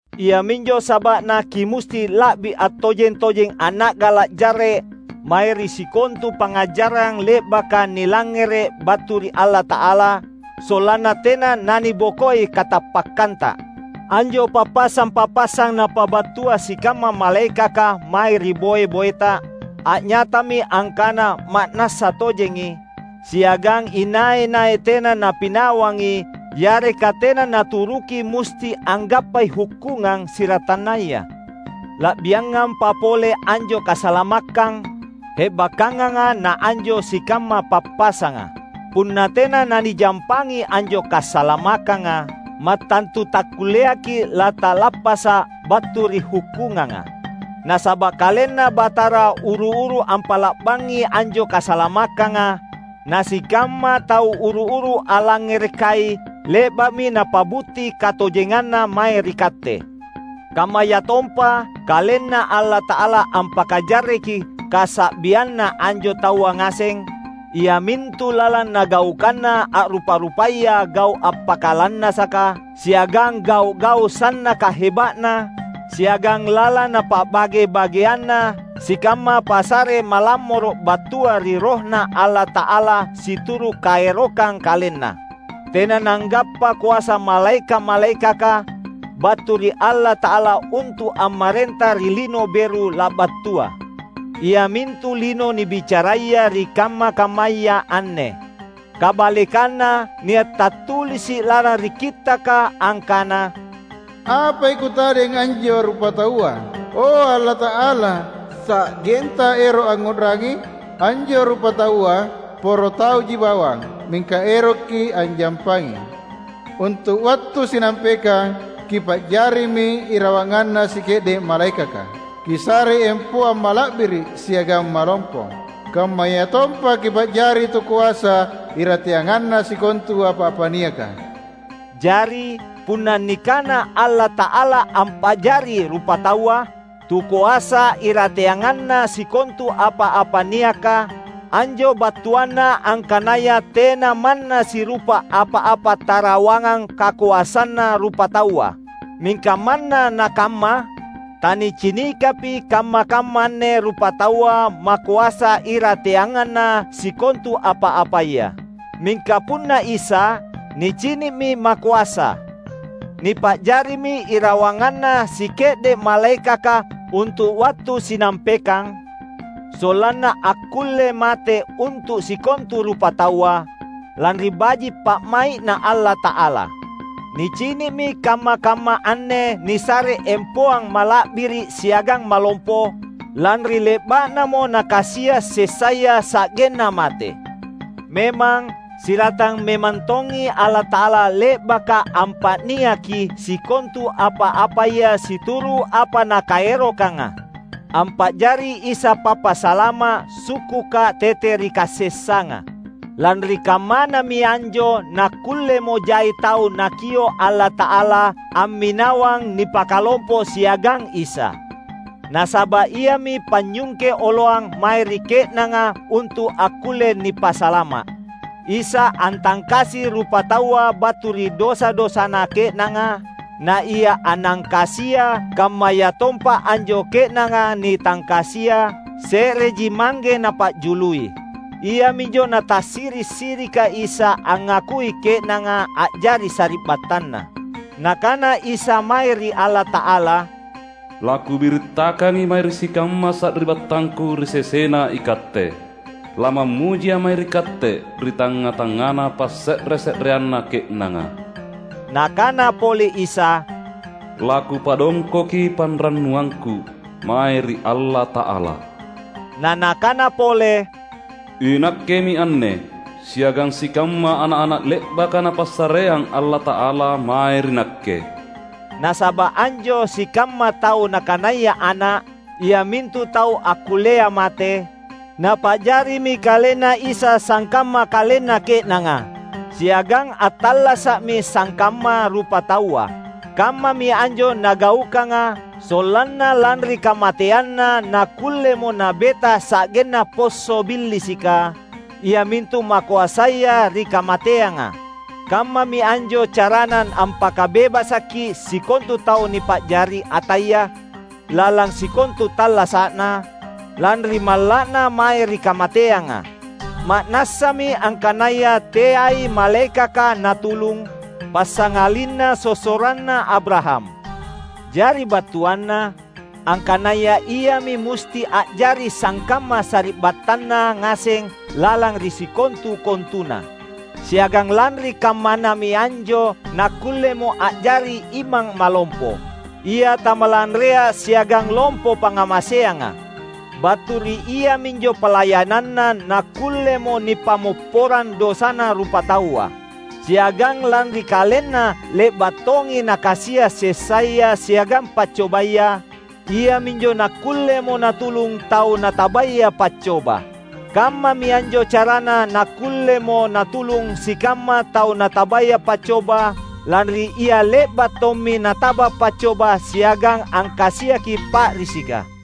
Iaminjo saba’na kimusti la’bi attojeng-tojeng anna’gala’ jarre’ mae ri sikontu pangngajarang le’baka nilangngere’ battu ri Allata’ala, sollanna tena nanibokoi katappakkanta. Anjo pappasang-pappasang napabattua sikamma malaekaka mae ri boe-boeta a’nyatami angkana ma’nassa tojengi, siagang inai-nai tena napinawangi yareka tena naturuki musti anggappai hukkungang siratannaya. La’biangampa pole anjo kasalamakkang hebakkanganga na anjo sikamma pappasanga. Punna tena nanijampangi anjo kasalamakkanga, mattantu takkulleaki’ lata’lappasa’ battu ri hukkunganga. Nasaba’ KalenNa Batara uru-uru ampa’la’bangi anjo kasalamakkanga; na sikamma tau uru-uru allangngerekai le’ba’mi napa’butti katojenganna mae ri katte. Kammayatompa, KalenNa Allata’ala ampakajarreki kasa’bianna anjo taua ngaseng, iamintu lalang Nagaukanna a’rupa-rupaya gau’ appakalannasaka siagang gau’-gau’ sannaka heba’na; siagang lalang Napa’bage-bageanna sikamma passare malammoro’ battua ri RohNa Allata’ala situru’ kaerokang KalenNa. Tena nanggappa koasa malaeka’-malaekaka battu ri Allata’ala untu’ ammarenta ri lino beru labattua, iamintu lino nibicaraya ri kamma-kammaya anne. Kabalekanna, nia’ tattulisi’ lalang ri Kittaka angkana, "Apai kutadeng anjo rupataua, o Allata’ala, sa’genTa ero’ angngu’rangi? Anjo rupataua poro tauji bawang, mingka erokKi’ anjampangi! Untu’ wattu sinampekang Kipa’jarimi irawanganna sike’de’ malaekaka; Kisarei empoang mala’biri’ siagang malompo, kammayatompa Kipa’jari tukoasa irateanganna sikontu apa-apa niaka." Jari, punna nikana Allata’ala ampa’jari rupataua "tukoasa irateanganna sikontu apa-apa niaka," anjo battuanna angkanaya tena manna sirupa apa-apa tarawangang kakoasanna rupataua. Mingka manna nakamma, tanicinikapi kamma-kamma anne rupataua makoasa irateanganna sikontu apa-apaya. Mingka punna Isa, nicini’mi makoasa! Nipa’jarimi irawanganna sike’de’ malaekaka untu’ wattu sinampekang; sollanna akkulle mate untu’ sikontu rupataua, lanri baji’ pa’mai’Na Allata’ala. Nicini’mi kamma-kamma anne nisare empoang mala’biri’ siagang malompo lanri le’ba’namo Nakasia’ sessaya sa’genna mate. Memang siratang memang tongi Allata’ala — le’baka ampa’niaki sikontu apa-apaya situru’ apa Nakaerokanga — ampa’jari Isa Pappasalama’ sukkuka tete ri kasessanga. Lanri kammanami anjo nakkullemo jai tau Nakio’ Allata’ala amminawang nipakalompo siagang Isa. Nasaba’ Iami panynyungke oloang mae ri ke’nanga untu’ akkulle nipasalama’. Isa antangkasi rupataua battu ri dosa-dosana ke’nanga; na Ia annangkasia, kammayatompa anjo ke’nanga nitangkasia, se’reji Mangge napa’jului. Iaminjo natasiri’-sirika Isa angngakui ke’nanga a’jari sari’battanNa. Nakana Isa mae ri Allata’ala, "LaKubirittakangi mae ri sikamma sari’battangKu ri sesena iKatte. LamammujiA’ mae ri Katte ri tangnga-tangngana passe’re-se’reanna ke’nanga." Nakana pole Isa, "LaKupadongkoki panrannuangKu mae ri Allata’ala." Na Nakana pole, "INakkemi anne, siagang sikamma ana’-ana’ le’baka Napassareang Allata’ala mae ri Nakke." Nasaba’ anjo sikamma tau Nakanaya ana’, iamintu tau akkullea mate, napa’jarimi KalenNa Isa sangkamma kalenna ke’nanga, siagang attallasa’mi sangkamma rupataua. Kammami anjo Nagaukanga, sollanna lanri kamateanNa nakkullemo Nabeta sa’genna posso’ Billisika, iamintu makoasaya ri kamateanga. Kammami anjo caraNa ampakabebasaki sikontu tau nipa’jari ataya lalang sikontu tallasa’na, lanri malla’na mae ri kamateanga. Ma’nassami angkanaya teai malaekaka Natulung, passangalinna sossoranna Abraham. Jari battuanna, angkanaya Iami musti a’jari sangkamma sari’battanNa ngaseng lalang ri sikontu-kontuna. Siagang lanri kammanami anjo nakkullemo a’jari Imang Malompo, Ia tamalanrea siagang lompo pangngamaseanga. Battu ri iaminjo palayananNa nakkullemo nipammopporang dosana rupataua. Siagang lanri KalenNa le’ba’ tongi Nakasia’ sessaya siagang paccobaya, iaminjo nakkullemo Natulung tau natabaya paccoba. Kammami anjo carana nakkullemo Natulung sikamma tau natabaya paccoba, lanri Ia le’ba’ tommi nataba paccoba siagang angkasiaki pa’risika.